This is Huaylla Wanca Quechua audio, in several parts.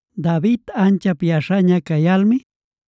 David anchap yaśhaña cayalmi,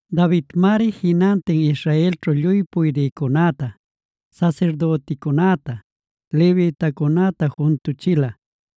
Davidmari jinantin Israelćhu lluy puydïcunäta, sasirdüticunäta, levitacunäta juntüchila.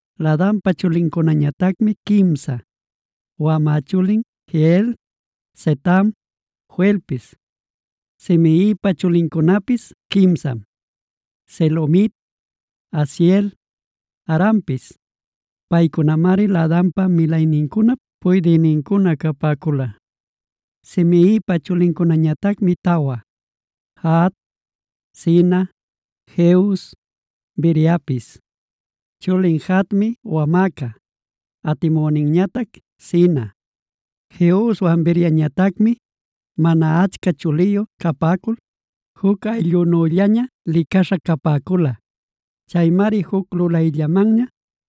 Laadanpa chulincunañatacmi quimsa: Wamä chulin Jehiel, Zetam, Joelpis. Simeipa chulincunapis quimsam: Selomit, Haziel, Haranpis. Paycunamari Laadanpa milaynincunap puydïnincuna capäcula. Simeipa chulincunañatacmi tawa: Jahat, Zina, Jeus, Beriapis. Chulin Jahatmi wamäca, atimüninñatac Zina. Jeuswan Beriañatacmi mana achca chuliyu capäcul juc ayllunüllaña licaśha capäcula. Chaymari juc lulayllamanña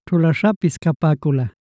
ćhulaśhapis capäcula.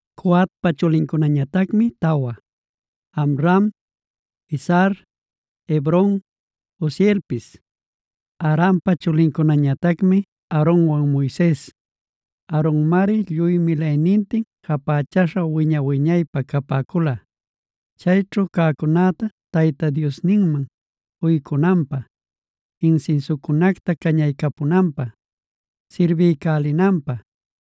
Coatpa chulincunañatacmi tawa: Amram, Izhar, Hebron, Uzielpis. Amrampa chulincunañatacmi Aaronwan Moises. Aaronmari lluy milaynintin japächaycuśha wiña-wiñaypä capäcula, chuya cäcunäta Tayta Diosman uycunanpä, insinsiucunacta cañaycapäcunanpä, sirbiycälinanpä,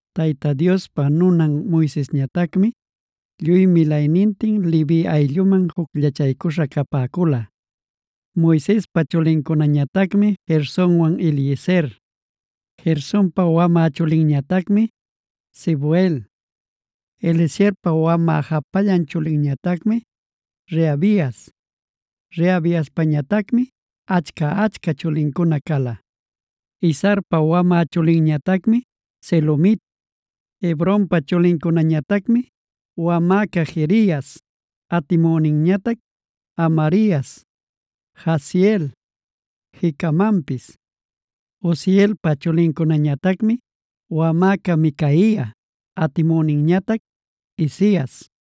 Tayta Diospa nunan Moisesñatacmi, lluy milaynintin Levi aylluman jucllachaycuśha capäcula. Moisespa chulincunañatacmi Gersonwan Eliezer. Gersonpa wamä chulinñatacmi Sebuel. Eliezerpa wamä japallan chulinñatacmi Rehabias. Rehabiaspañatacmi achca-achca chulincuna cala. Izharpa wamä chulinñatacmi Selomit. Hebronpa chulincunañatacmi: wamäca Jerias, atimüninñatac Amarias, Jahaziel, Jecamanpis. Uzielpa chulincunañatacmi: wamäca Micaia, atimüninñatac Isias.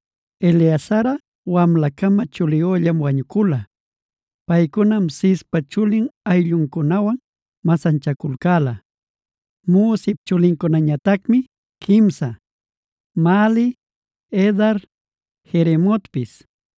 Eleazarꞌa wamla-cama chuliyüllam wañucula. Paycunam Cispa chulin aylluncunawan masanchaculcäla. Musip chulincunañatacmi quimsa: Mahli, Edar, Jeremotpis.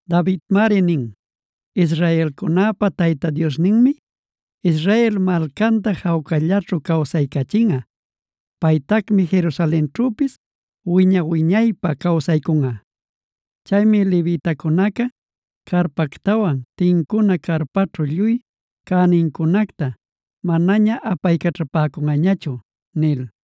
Davidmari nin: “Israelcunäpa Tayta Diosninmi, Israel malcanta jawcallaćhu cawsaycachinꞌa. Paytacmi Jerusalenćhüpis wiña-wiñaypä cawsaycunꞌa. Chaymi levitacunaca carpactawan tincuna carpaćhu lluy cänincunacta manaña apaycaćhapäcunꞌañachu” nil.c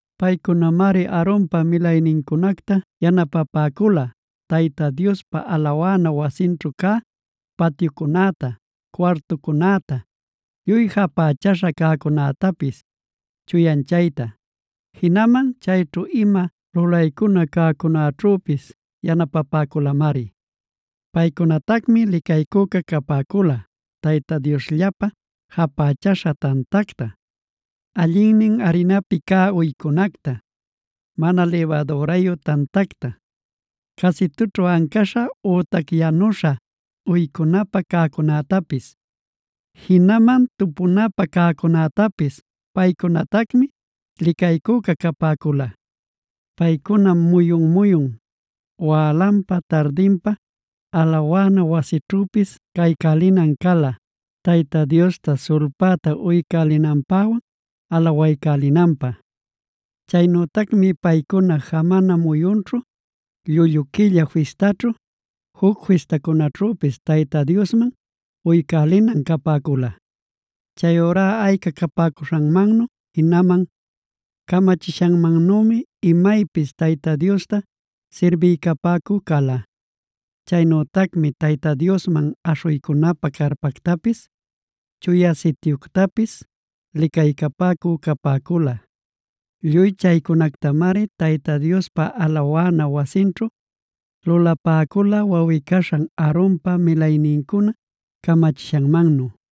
Paycunamari Aaronpa milaynincunacta yanapapäcula Tayta Diospa alawana wasinćhu cä patyucunäta, cuartucunäta, lluy japächäśha cäcunätapis chuyanchayta. Jinaman chayćhu ima lulaycuna cäcunäćhüpis yanapapäculamari. Paycunatacmi licaycüca capäcula Tayta Diosllapä japächäśha tantacta, allinnin arinapi cä uycunacta, mana libadürayu tantacta, casitućhu ancäśha ütac yanüśha uycunapä cäcunätapis. Jinaman tupunapä cäcunätapis paycunatacmi licaycüca capäcula. Paycunam muyun-muyun wälanpa tardinpa alawana wasićhüpis caycälinan cala, Tayta Diosta sulpäta uycälinanpäwan alawaycälinanpä. Chaynütacmi paycuna jamana muyunćhu, llullu quilla fistaćhu, juc fistacunaćhüpis Tayta Diosman uycälinan capäcula. Chayurá ayca capäcuśhanmannu jinaman camachishanmannümi imaypis Tayta Diosta sirbiycapäcü cala. Chaynütacmi Tayta Diosman aśhuycunapä carpactapis, Chuya Sityuctapis licaycapäcü capäcula. Lluy chaycunactamari Tayta Diospa alawana wasinćhu lulapäcula wawꞌi-caśhan Aaronpa milaynincuna camachishanmannu.d